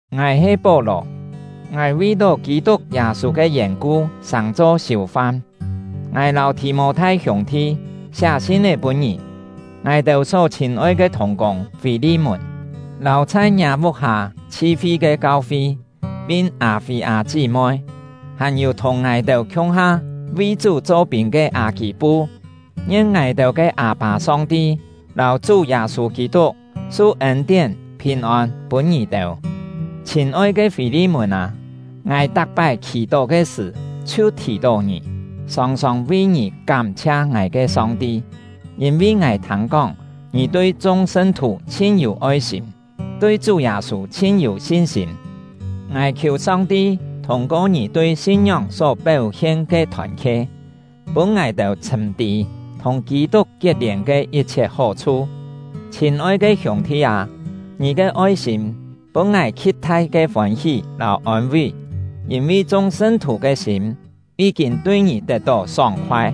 Ngài he Pó-lò; ngài vi-tó Kî-tuk Yâ-sû ke yèn-ku sàng-cho siù-fam. Ngài lâu Thì-mô-thai hiûng-thi siá sin-é pûn ngì — ngài-têu só chhîn-oi ke thùng-kûng Fî-li-mùn, lâu chhai ngiâ vuk-hâ chhi-fi ke kau-fi, pin Â-fî-â chí-moi, hàn-yû thùng ngài-têu khiung-ha vi Chú cho-pîn ke Â-kî-pu. Ngien ngài-têu ke Â-pâ Song-ti lâu Chú Yâ-sû Kî-tuk su ên-tién, phìn-ôn pûn ngì-têu! Chhîn-oi ke Fî-li-mùn â, ngài tak-pái khì-tó ke sṳ̀ chhiu thì-tó ngì, sòng-sòng vi ngì kám-chhia ngài ke Song-ti; yîn-vi ngài thâng-kóng ngì tui chung sṳn-thù chhin yû oi-sîm, tui Chú Yâ-sû chhin yû sin-sîm. Ngài khiù Song-ti thûng-ko ngì tui sin-ngióng só péu-hien ke thòn-khe, pûn ngài-têu chhṳ̂m tî thùng Kî-tuk kiet-lièn ke yit-chhiet hó-chhu. Chhîn-oi ke hiûng-thi â, ngì ke oi-sîm pûn ngài khi̍t-thai ke fôn-hí lâu ôn-ví; yîn-vi chung sṳn-thù ke sîm yí-kîn tui ngì tet-tó sóng-khoai.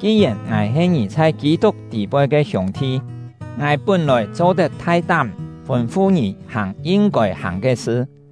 Ki-yèn ngài he ngì chhai Kî-tuk tî-poi ke hiûng-thi, ngài pún-lòi cho-tet thai-tám fûn-fu ngì hàng yin-kôi hàng ke sṳ;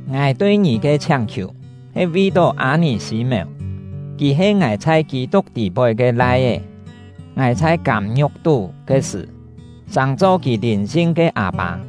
Ngài tui ngì ke chhiáng-khiù he vi-tó Â-nì-sî-mèu. Kì he ngài chhai Kî-tuk tî-poi ke lai-é; ngài chhai kâm-ngiu̍k tú ke sṳ̀ sàng-cho kì lìn-sin ke â-pâ.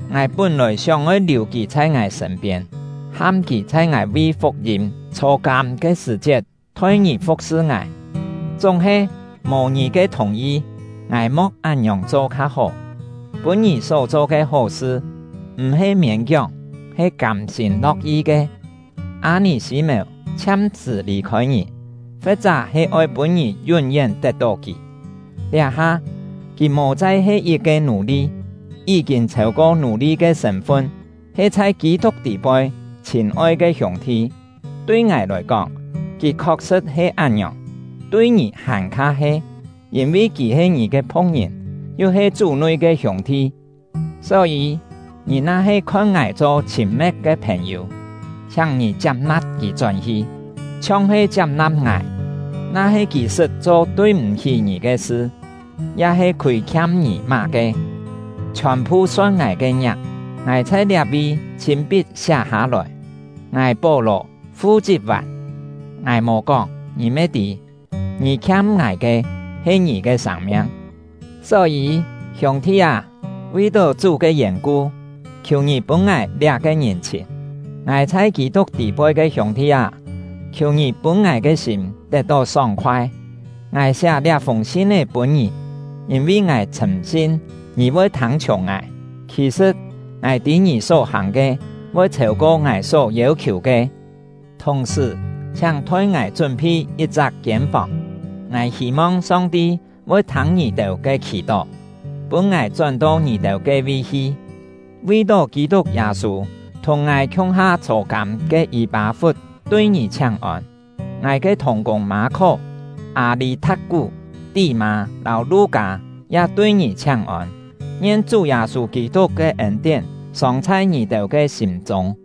Ngài pún-lòi sióng-oi liù kì chhai ngài sṳ̂n-piên, ham kì chhai ngài vi fuk-yîm chhô-kâm ke sṳ̀-chiet thoi ngì fu̍k-sṳ ngài; chúng-he, mò ngì ke thùng-yi, ngài mo̍k án-ngiòng cho kha-hó, pûn ngì só-cho ke hó-sṳ m̀-he miên-kióng, he kâm-sîm lo̍k-yi ke. Â-nì-sî-mèu chhiam-sṳ̀ lì-khôi ngì, fe̍t-chá he oi pûn ngì yún-yén tet-tó kì. Liá-ha, kì mò chai he yit-ke nù-li, yí-kîn chhêu-ko nù-li ke sṳ̂n-fun, he chhai Kî-tuk tî-poi chhîn-oi ke hiûng-thi. Tui ngài lòi kóng, kì khok-sṳ̍t he án-ngiòng, tui ngì hàn-kha he! Yîn-vi kì he ngì ke phu̍k-ngìn, yu he Chú-nui ke hiûng-thi! Só-yî, ngì na-he khon ngài cho chhîn-me̍t ke phèn-yû, chhiáng ngì chiap-na̍p kì chón-hi, chhiong he chiap-na̍p ngài. Na-he kì sṳt cho tui-m̀-hí ngì ke sṳ, ya-he khûi-khiam ngì má-ke, chhiòn-phu son ngài ke ngiak. Ngài chhai liá-vi chhîn-pit siá hâ-lòi: Ngài — Pó-lò fu-chit vàn. Ngài mò kóng, ngì me tî, ngì khiam ngài ke he ngì ke sâng-miang! Só-yî, hiûng-thi â, vi-tó Chú ke yèn-ku, khiù ngì pûn ngài liá-ke ngìn-chhìn! Ngài chhai Kî-tuk tî-poi ke hiûng-thi â, khiù ngì pûn ngài ke sîm tet-tó sóng-khoai! Ngài siá liá-fûng sin-é pûn ngì, yîn-vi ngài chhṳ̂m-sin ngì voi thâng-chhiùng ngài. Khì-sṳ̍t, ngài tî ngì só-hàng ke voi chhêu-ko ngài só yêu-khiù ke. Thùng-sṳ̀, chhiáng thoi ngài chún-phi yit-chak kiên-fòng; ngài hî-mong Song-ti voi thâng ngì-têu ke khì-tó, pûn ngài chón-to ngì-têu ke-vi hi. Vi-tó Kî-tuk Yâ-sû thùng ngài khiung-ha chhô-kâm ke Yî-pâ-fut tui ngì chhiáng-ôn. Ngài ke thùng-kûng Mâ-khó, Â-lî-tha̍t-kú, Tí-mâ, lâu Lu-kâ ya tui ngì chhiáng-ôn. Ngien Chú Yâ-sû Kî-tuk ke ên-tién sòng chhai ngì-têu ke sîm-chûng!